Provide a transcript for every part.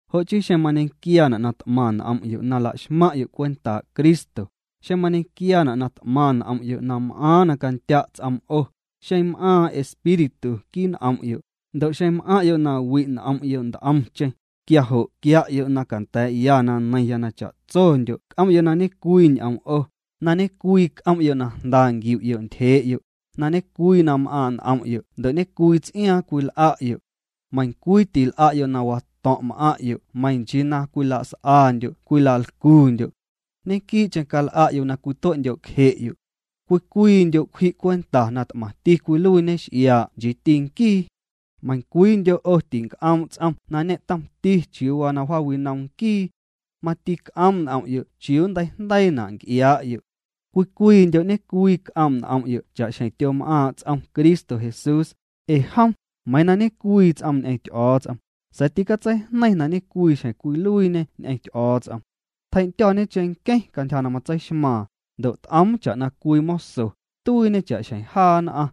Jo' chii xeⁿ mañequiaana' na t'maⁿ n'om'yo' na la'xmaⁿ'yo' cwentaa' Cristo, xeⁿ mañequiaana' na t'maⁿ n'om'yo' na m'aaⁿ na candya' ts'oom 'o, xeⁿ m'aaⁿ Espíritu quii' n'om'yo', ndo' xeⁿ m'aⁿ'yo' na wi' n'om'yo' nt'omcheⁿ, quia jo' quia'yo' na canda̱a̱'ya na neiⁿya na cha'tsondyo' c'om'yo' na ñe'cwii ñ'oom 'o, na ñe'cwii c'om'yo' na jnda nquiu'yo' ntyjee'yo', na ñe'cwii na m'aaⁿ' n'om'yo' ndo' ñe'cwii ts'iaaⁿ cwil'a'yo'. Meiⁿcwii til'a'yo' na wato̱ⁿ' m'aⁿ'yo' meiⁿ nchii na cwilas'andyo' cwilalcundyo'. Ñequii'cheⁿ cal'a'yo' na cwitue'ndyo'cje'yo'. Cwii cwiindyo' cwji' cwenta na t'maⁿti cwiluiiñe x'iaa' nchiiti nquii. Meiⁿcwiindyo' 'o tinc'oom' ts'om na ñe'tomti chiuu waa na wjaawinom nquii. Mati c'oom' n'om'yo' chiuu nnteijndeiina' nc'iaa'yo'. Cwii cwiindyo' ñe'cwii c'oom' n'om'yo' cha'xjeⁿ tyom'aaⁿ' ts'om Cristo Jesús, ee jom: Meiiⁿ na ñe'cwii ts'oom ñ'eⁿ Ty'o̱o̱ts'om, sa̱a̱ ticatseijneiⁿ na ñecwii xjeⁿ cwiluiiñê ñ'eⁿñe Jom. Tjei'ndyo̱o̱ñe cheⁿnqueⁿ cantyja na matseixmaaⁿ, ndo' t'oom cha'na cwii moso, tuiiñê cha'xjeⁿ jaa nn'aⁿ.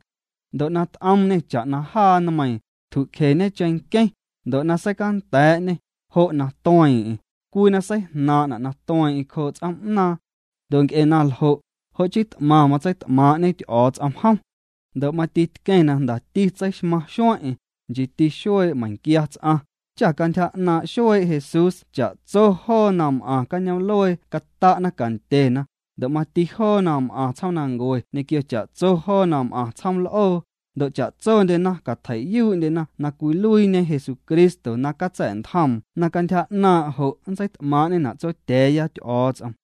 Ndo' na t'oomñê cha'na jaa nmeiiⁿ, tjucjeñe cheⁿnqueⁿ, ndo' na seicanda̱a̱'ñê, jo' na tueeⁿ'eⁿ, cwii na seijnaaⁿ'na' na tueeⁿ'eⁿ cjoo' ts'oom'naaⁿ. Ndo' nc'e na ljo', jo' chii t'maⁿ matseit'maaⁿ'ñe Ty'o̱o̱ts'om jom. Ndo' mati tqueⁿ na jndati tseixmaⁿ xueⁿ'eⁿ, nchiiti xuee' meiⁿquia ts'aⁿ, cha cantyja 'naaⁿ' xuee' Jesús cha'tso joo na m'aⁿ cañoom'luee cata'na cantyena, ndo' mati joo na m'aⁿ tsjoomnancue ñequio cha'tso joo na m'aⁿ tsjoom l'oo, ndo' cha'tsondyena catjei'yuu'ndyena na cwiluiiñe Jesucristo na catsa̱'ntjoom na cantyja 'naaⁿ' jo' nntseit'maaⁿ'ñena' Tsotya̱a̱ya Ty'o̱o̱ts'om.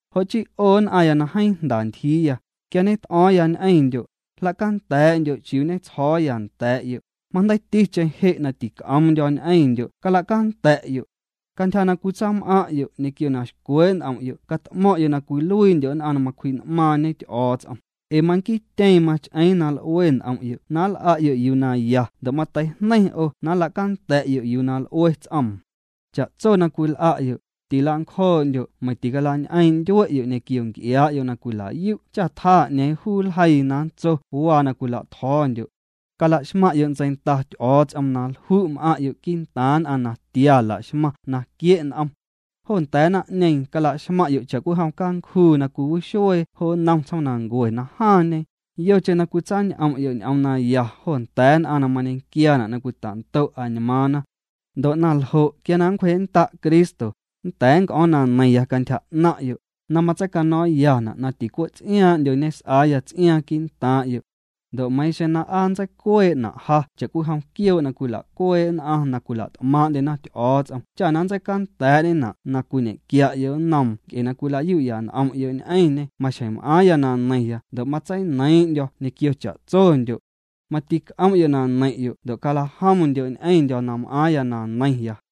Jo' chii 'o nn'aⁿya na jeeⁿ jnda ntyjiiya, quia ñet'o̱o̱ⁿya ñ'eⁿndyo', jla'canda̱a̱'ndyo' chiuu ñetsjo̱o̱ya nda̱a̱'yo', majndeiiticheⁿ je' na tic'o̱o̱ⁿndyo̱ ñ'eⁿndyo' cala'canda̱'yo'. Cantyja na cwitsam'aⁿ'yo' ñequio na xcwee' n'om'yo' cat'mo̱ⁿ'yo' na cwiluiindyo' nn'aⁿ na macwji'n'maaⁿñe Ty'o̱o̱ts'om, ee manquiityeeⁿ mach'eeⁿ na l'ue n'om'yo' na nl'a'yo' yuu na ya ndo' mateijneiⁿ 'o na nla'canda̱'yo' yuu na l'ue ts'oom. Cha'tso na cwil'a'yo', tila'ncjoo'ndyo' meiⁿ ticalañ'eeⁿ' ndyue'yo' ñequio nc'iaa'yo' na cwila'yu' cha tjaa 'ñeeⁿ juu nljeii na nntso waa na cwila'tjo̱o̱ndyo'. Cala'xmaⁿ'yo' ntseinda Ty'o̱o̱ts'om na lju' m'aⁿ'yo' quii'ntaaⁿ nn'aⁿ natia laxmaⁿ na quie' n'om. Jo nda̱a̱ naⁿ'ñeeⁿ cala'xmaⁿ'yo' cha'cwijom cancjuu na cwiwixuee jo nnom tsjomnancuee na jaaⁿñe, yocheⁿ na cwitsañ'om'yo' ñ'oom naya jo nda̱a̱ nn'aⁿ na mañequiaana' na cwita'ndo' añmaaⁿna. Ndo' na ljo' quia na nncwjee'nnda' Cristo, nnda̱a̱ nnc'o̱o̱ⁿ na neiⁿya cantyja 'naⁿ'yo', na matseino̱o̱ⁿyana' na ticwe' ts'iaaⁿ'ndyo ñes'aaya ts'iaaⁿ quii'ntaaⁿ'yo'. Ndo' meiiⁿ xeⁿ na aa nntseicuee'na' ja cha'cwijom quioo' na cwila'cuee' nn'aⁿ na cwila't'maaⁿ'ndyena Ty'o̱o̱ts'om cha na nntseicanda̱a̱'ñena' na cwiñequia'yo' nnoom nc'e na cwilayu'ya n'om'yo' ñ'eⁿñê maxjeⁿ m'aaⁿya na neiⁿya ndo' matseineiiⁿ'ndyo̱ ñequio cha'tsondyo'. Mati c'om'yo' na neiⁿ'yo' ndo' calajomndyo' ñ'eⁿndyo̱ na m'aaⁿya na neiⁿya.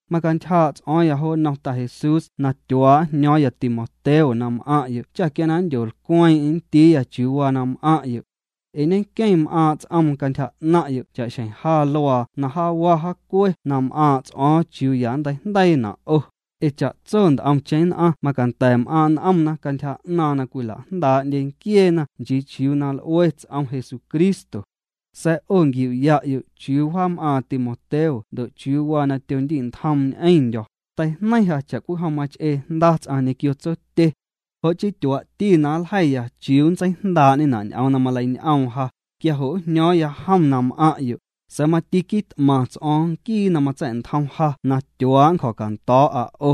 Macantyjaa' ts'o̱o̱ⁿya jo nnom Ta Jesús na tyuaa' njño̱o̱ⁿya Timoteo na m'aⁿ'yo' cha quia na nndyolcweeⁿ'eⁿ nndiiya chiuu waa na m'aⁿ'yo'. Ee ñenqueⁿ m'aaⁿ' ts'oom cantyja 'naⁿ'yo' cha'xjeⁿ ja luaa na jaawa jaacue na m'aaⁿ' ts'o̱o̱ⁿ chiuu ya nnteijndeiina' 'o, ee cha'tso nt'omcheⁿ nn'aⁿ macanda̱ m'aaⁿ' n'omna cantyja 'naaⁿ na cwila'jndaa'ndye nquieena nchii chiuu waa na l'ue ts'om Jesucristo. Sa̱a̱ 'o nquiu'ya'yo' chiuu wjaam'aaⁿ Timoteo ndo' chiuu waa na tyondi'ntjoom n'eⁿndyo̱, teijneiⁿ ja cha'cwijom mach'ee jnda ts'aⁿ ñequio tsotye. Jo' chii tyuaa'ti na nljeiya chiuu nntseijndaa'ñena' ñ'oom na maleiñ'oom ja, quia jo' njño̱o̱ⁿya jom na m'aⁿ'yo', sa̱a̱ mati quit'maⁿ ts'o̱o̱ⁿ Nquii na matsa̱'ntjom ja na tyuaa' nncjo̱ cando̱o̱'a 'o.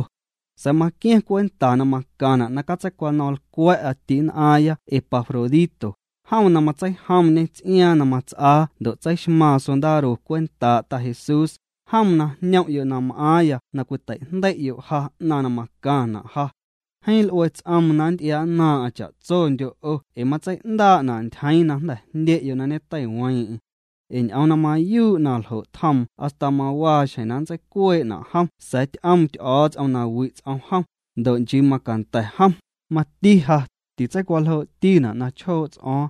Sa̱a̱ maqua̱ⁿ cwenta na macaⁿna' na catseicwano̱ⁿlcwa̱'a ti'nn'aaⁿya Epafrodito, jom na matseijomñê ts'iaaⁿ na mats'aa ndo' tseiXmaaⁿ sondaro cwentaa' Ta Jesús, jom na jñom'yo' na m'aaⁿya na cwiteijndei'yo' ja 'naⁿ na macaⁿna' ja. Jeeⁿ l'ue ts'oom na nnty'iaa'nnaaⁿ'aⁿ cha'tsondyo' 'o ee matsei'ndaa'na' ntyjeeⁿ na jnda̱ jndye'yo' na ñeteiweeⁿ'eⁿ. Ee ñ'oom na mayuu' naljo' tjoom hasta mawaa xjeⁿ na ntseicuee'na' jom sa̱a̱ ty'oom Ty'o̱o̱ts'om na wi' ts'om jom, ndo' nchii macanda̱ jom, mati ja, titseicwaljoo'tina' na chjoo' ts'o̱o̱ⁿ.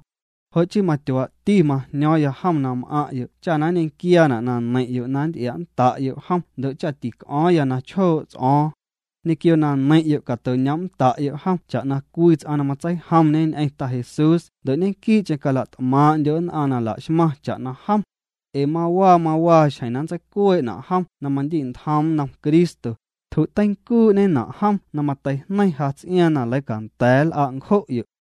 Jo' chii matyuaa'ti majño̱o̱ⁿya jom na m'aⁿ'yo' cha na nñequiaana' na neiⁿ'yo' na nnty'ia'nnda'yo' jom ndo' cha tic'o̱o̱ⁿya na chjoo' ts'o̱o̱ⁿ. Ñequio na neiⁿ'yo' cato'ñoom'nnda'yo' jom cha'na cwii ts'aⁿ na matseijomñe ñ'eⁿ Ta Jesús ndo' ñequii'cheⁿ cala't'maaⁿ'ndyo' nn'aⁿ na laxmaⁿ cha'na jom. Ee mawaa mawaaxjeⁿ na nntseicuee'na' jom na mandi'ntjoom nnom Cristo. Tju'teincuu'ñena' jom na mateijneiⁿ ja ts'iaaⁿ na leicanda̱a̱ nl'a' ncjo'yo'.